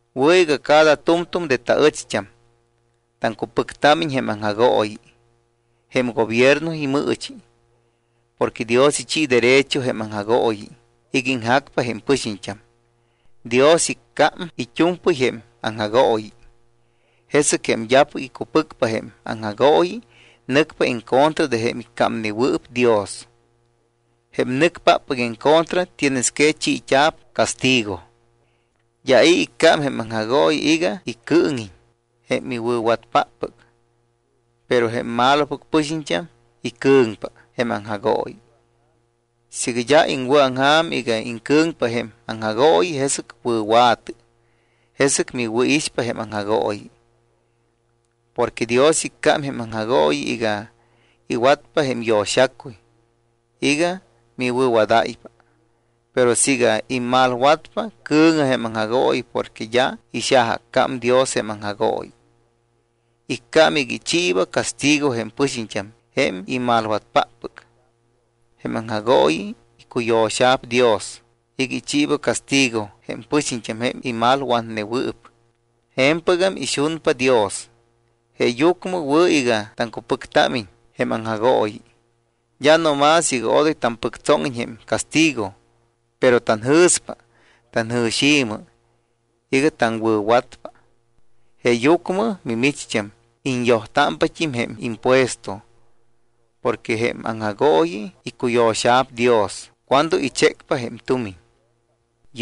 Wɨ̱ iga cada tu̱mtu̱m de taɨcht́am taŋcupɨctámiñ jém aŋjagooyi, jém gobierno imɨɨchi. Porque Dios ichi derecho jém aŋjagooyi iga iŋjacpa jém pɨxiñt́am. Dios iccám it́u̱mpɨy jém aŋjagooyi. Jesɨc jém d́apɨc icupɨcpa jém aŋjagooyi nɨcpa en contra de jém iccámnewɨɨp Dios. Jém nɨcpáppɨc en contra tienes que chiit́a̱p castigo. D́a i̱ iccám jém aŋjagooyi iga icɨɨŋiñ jém iwɨ̱watpáppɨc. Pero jém malopɨc pɨxiñt́am icɨ̱ŋpa jém aŋjagooyi. Siiga d́a iŋwɨ̱aŋja̱m iga iŋcɨ̱ŋpa jém aŋjagooyi, jesɨc wɨ̱wa̱tɨ. Jesɨc miwɨ̱ixpa jém aŋjagooyi. Porque Dios iccám jém aŋjagooyi iga iwatpa jém yo̱xacuy iga miwɨ̱wadáypa. Pero siiga immalwatpa, cɨ̱ŋɨ jém aŋjagooyi porque d́a ixajaaccám Dios jém aŋjagooyi. Iccám iga ichiiba castigo jém pɨxiñt́am jém imalwatpáppɨc. Jém aŋjagooyi icuyo̱xa̱p Dios iga ichiiba castigo jém pɨxiñt́am jém imalwatnewɨɨp. Je̱mpɨgam ixunpa Dios. Jeeyucmɨ wɨ̱ iga taŋcupɨctámiñ jém aŋjagooyi, d́a no más iga odoy tampɨctsóŋiñ jém castigo, pero tanjɨ̱spa tanjɨ̱xi̱mɨ iga taŋwɨ̱watpa. Jeeyucmɨ mimicht́am iñyojtámpat́im jém impuesto. Porque jém aŋjagooyi icuyo̱xa̱p Dios cuando ichécpa jém tumiñ.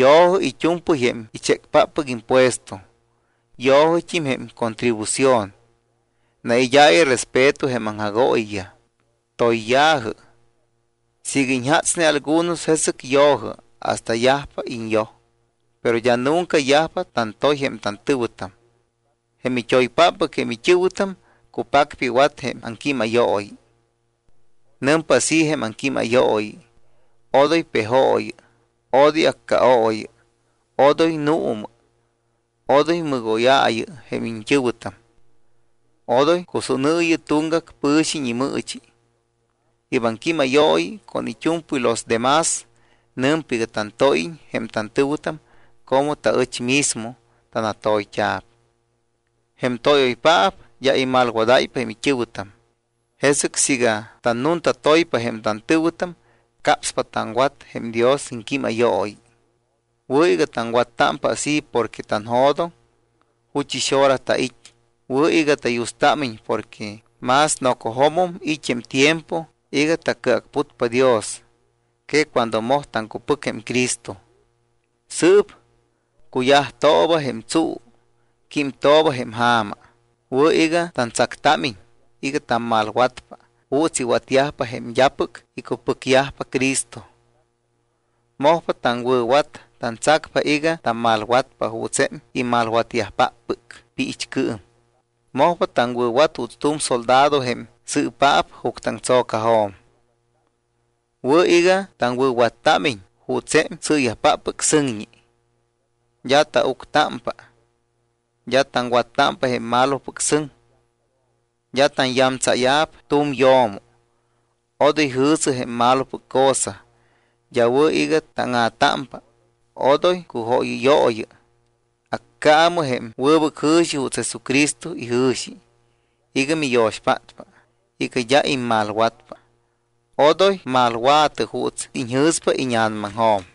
Yo̱jɨ it́u̱mpɨy jém ichécpáppɨc impuesto. Yo̱jɨt́im jém contribución. Naid́aayɨ respeto jém aŋjagooyiyaj. Toyya̱jɨ. Siiga iñjatsne algunos, jesɨc yo̱jɨ hasta yajpa iñyoj. Pero d́a nunca yajpa tantoy jém tantɨ̱wɨtam. Jém it́oypáppɨc jém it́ɨ̱wɨtam cupacpa iwat jém aŋquímayooyi. Nɨmpa así jém aŋquímayooyi: “Odoy pejooyɨ. Odoy accaooyɨ. Odoy nuumɨ. Odoy mɨgóyaayɨ jém iñt́ɨ̱wɨtam. Odoy cusúnɨɨyɨ tuŋgac pɨ̱xiñ imɨɨchi.” Yɨ́p aŋquímayooyi con it́u̱mpɨy los demás nɨmpa iga tantóyiñ jém tantɨ̱wɨtam como taɨch mismo tanatoyt́a̱p. Jém tóyoypaap d́a imalwadáypa jém it́ɨ̱wɨtam. Jesɨc siiga tannuntatoypa jém tantɨ̱wɨtam, capspa taŋwat jém Dios iŋquímayooyi. Wɨ̱ iga taŋwattámpa así porque tanjo̱doŋ juchɨs hora tait́. Wɨ̱ iga tayustámiñ porque más nocojo̱mum it́ jém tiempo iga tacɨacputpa Dios que cuando moj taŋcupɨc jém Cristo. Sɨɨp cuyajtooba jém tsuu, químtooba jém ja̱ma. Wɨ̱ iga tantsactámiñ iga tammalwatpa juuts iwatyajpa jém d́apɨc icupɨcyajpa Cristo. Mojpa taŋwɨ̱wat. Tantsacpa iga tammalwatpa juuts jém imalwatyajpáppɨc piichcɨɨm. Mojpa taŋwɨ̱wat juuts tu̱m soldado jém sɨɨpaap juctɨaŋtso̱cajo̱m. Wɨ̱ iga taŋwɨ̱wattámiñ juuts jém sɨɨyajpáppɨc sɨŋñi. D́a tauctámpa, d́a taŋwattámpa jém malopɨc sɨŋ. D́a tanyamtsáya̱p tu̱m yo̱mo, odoy jɨ̱sɨ jém malopɨc cosa. D́a wɨ̱ iga táŋa̱támpa, odoy cujóyɨyooyɨ. Accaamɨ jém wɨbɨc jɨ̱xi juuts Jesucristo ijɨ̱xi iga miyo̱xpátpa iga d́a immalwatpa. Odoy malwa̱tɨ juuts iñjɨ̱spa íña̱namaŋjo̱m.